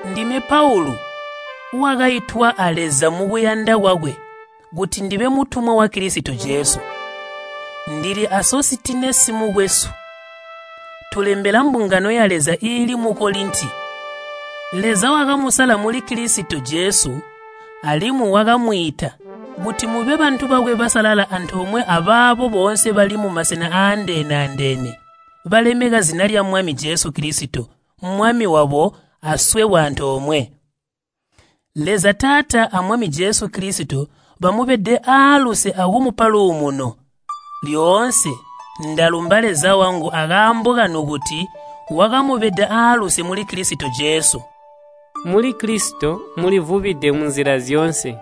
Ndime Paulu wakaitwa a Leza mukuyanda kwakwe kuti ndibe mutumwa wa Kilisito Jesu. Ndili a Sositinesi mukwesu. Tulembela mbungano ya Leza iili mu Kolinti. Leza wakamuzandula muli Kilisito Jesu alimwi wakamwiita kuti mube bantu bakwe basalala antoomwe abaabo boonse bali mumasena aandeene-andeene balemeka zina lya Mwami Jesu Kilisito, Mwami wabo aswebo antoomwe. Leza Taata a Mwami Jesu Kilisito bamubede aaluse akumupa luumuno. Lyoonse ndalumba Leza wangu akaambo kanu kuti wakamubeda aaluse muli Kilisito Jesu. Muli Kilisito mulivubide munzila zyoonse.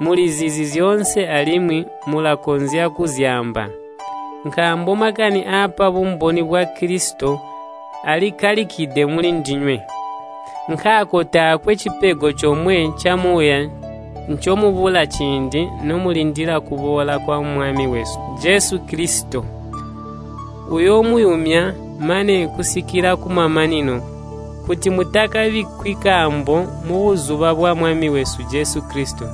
Mulizizi zyoonse alimwi mulakonzya kuzyaamba. Nkaambo makani aapa bumboni bwa Kilisito alikkalikide mulindinywe. Nkaako taakwe cipego comwe camuuya ncomubula ciindi nomulindila kuboola kwa Mwami wesu Jesu Kilisito. Uyoomuyumya mane kusikila kumamanino, kuti mutakabikkwi kaambo mubuzuba bwa Mwami wesu Jesu Kilisito.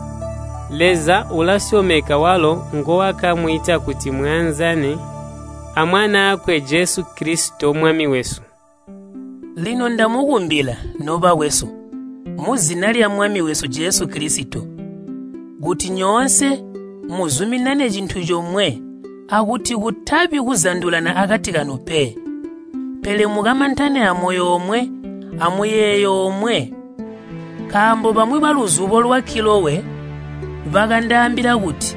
Leza ulasyomeka walo nguwakamwiita kuti muyanzane a Mwanaakwe Jesu Kilisito, Mwami wesu. Lino ndamukumbila, nobakwesu, muzina lya Mwami wesu Jesu Kilisito, kuti nyoonse muzuminane cintu comwe akuti kutabi kuzandulana akati kanu pe. Pele mukamantane amoyo omwe amuyeeyo omwe. Nkaambo bamwi baluzubo lwa Kilowe bakandaambila kuti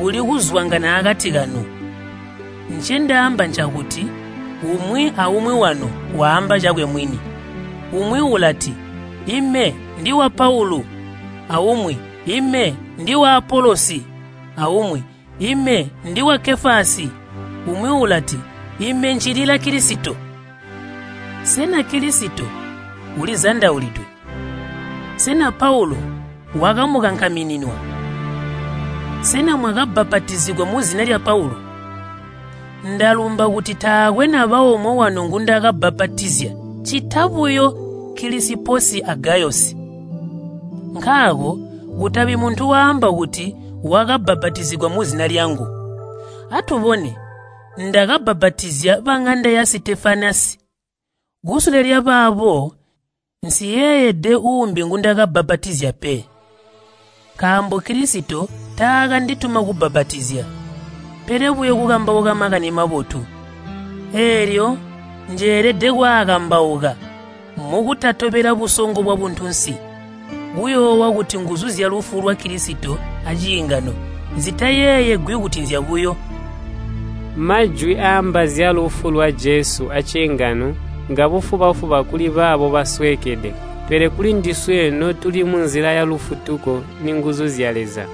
kuli kuzwangana akati kanu. Ncendaamba ncakuti umwi aumwi wanu waamba cakwe mwini. Umwi ulati, “Ime ndiwa Paulu,” aumwi “Ime ndiwa Apolosi,” aumwi, “Ime ndiwa Kefasi,” umwi ulati, “Ime ncilila Kilisito.” Sena Kilisito ulizandaulidwe? Sena Paulu wakamukankamininwa? Sena mwakabbapatizigwa muzina lya Paulu? Ndalumba kuti taakwe naba omwe wanu ngundakabbapatizya, ccita buyo Kilisiposi a Gayosi. Nkaako kutabi muntu waamba kuti wakabbapatizigwa muzina lyangu. Atubone, ndakabbapatizya baŋanda ya Sitefanasi. Kusule lyabaabo, nsiyeeyede uumbi ngundakabbapatizya pe. Nkaambo Kilisito taakanditumina kubbapatizya, pele buyo kukambauka Makani Mabotu. Eelyo njelede kwaakambauka mukutatobela busongo bwabuntunsi, kuyoowa kuti nguzu zyalufu lwa Kilisito aciingano zitayeeyegwi kuti nzyabuyo. Majwi aaamba zyalufu lwa Jesu aciingano ngabufuba-fuba kuli baabo basweekede, pele kulindiswe notuli munzila ya lufutuko ninguzu zya Leza.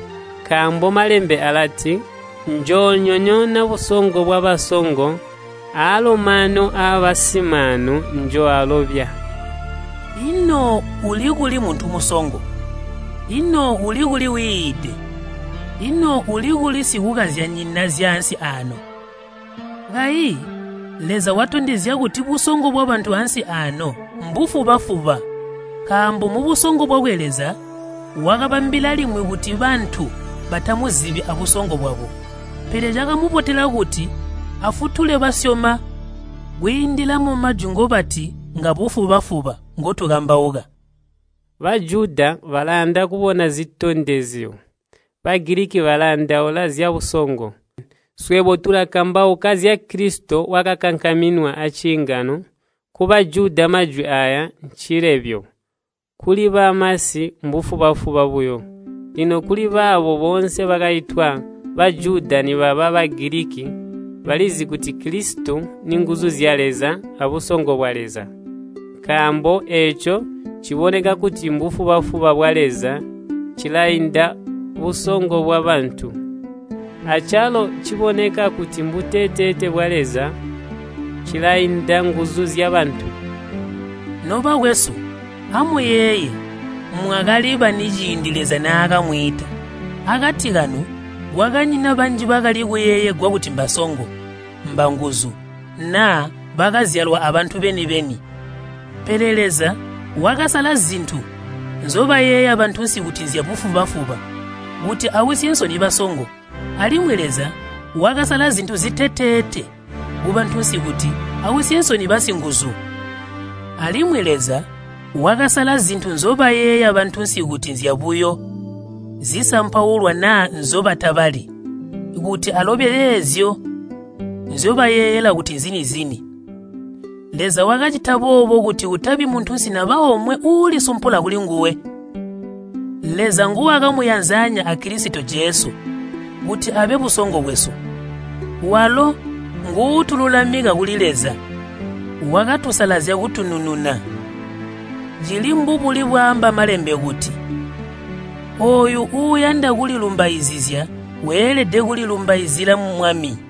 Nkaambo Malembe alati “Njoonyonyoona busongo bwabasongo, aalo maanu aabasimaanu njooalobya.” Ino uli kuli muntu musongo? Ino uli kuli wiide? Ino uli kuli sikukazyanyina zyaansi aano? Kayi Leza watondezya kuti busongo bwabantu ansi aano mbufuba-fuba. Nkaambo mubusongo bwakwe Leza wakabambila limwi kuti bantu batamuzibi abusongo bwabo. Pele cakamubotela kuti afutule basyoma kwiindila mumajwi ngobati ngabufuba-fuba ngotukambauka. Bajuda balayanda kubona zitondezyo, Bagiliki bayandaula zyabusongo. Swebo tulakambauka zya Kilisito wakakankaminwa aciingano, ku Bajuda majwi aaya ncilebyo, kuli bamasi mbufuba-fuba buyo. Lino kuli baabo boonse bakaitwa, Bajuda nibaba Bagiliki, balizi kuti Kilisito ninguzu zya Leza abusongo bwa Leza. Nkaambo eeco ciboneka kuti mbufuba-fuba bwa Leza cilainda busongo bwabantu, acalo ciboneka kuti mbuteteete bwa Leza cilainda nguzu zyabantu. Nobakwesu, amuyeeye, mwakali bani ciindi Leza naakamwiita. Akati kanu kwakanyina banji bakali kuyeeyegwa kuti mbasongo, mbanguzu naa bakazyalwa aabantu beni-beni. Pele Leza wakasala zintu nzyobayeeya bantunsi kuti nzyabufuba-fuba kuti ausye nsoni basongo. Alimwi Leza wakasala zintu ziteteete kubantunsi kuti ausye nsoni basinguzu. Alimwi Leza wakasala zintu nzyobayeeya bantunsi kuti nzyabuyo zisampaulwa naa nzyobatabali, kuti alobye eezyo nzyobayeeyela kuti nzini-zini. Leza wakacita boobo kuti kutabi muntunsi naba omwe uulisumpula kulinguwe. Leza nguwakamuyanzanya a Kilisito Jesu kuti abe busongo bwesu. Walo nguutululamika kuli Leza, wakatusalazya kutunununa. Cili mbubuli bwaamba Malembe kuti, “Ooyu uuyanda kulilumbaizizya weelede kulilumbaizila Mwami.”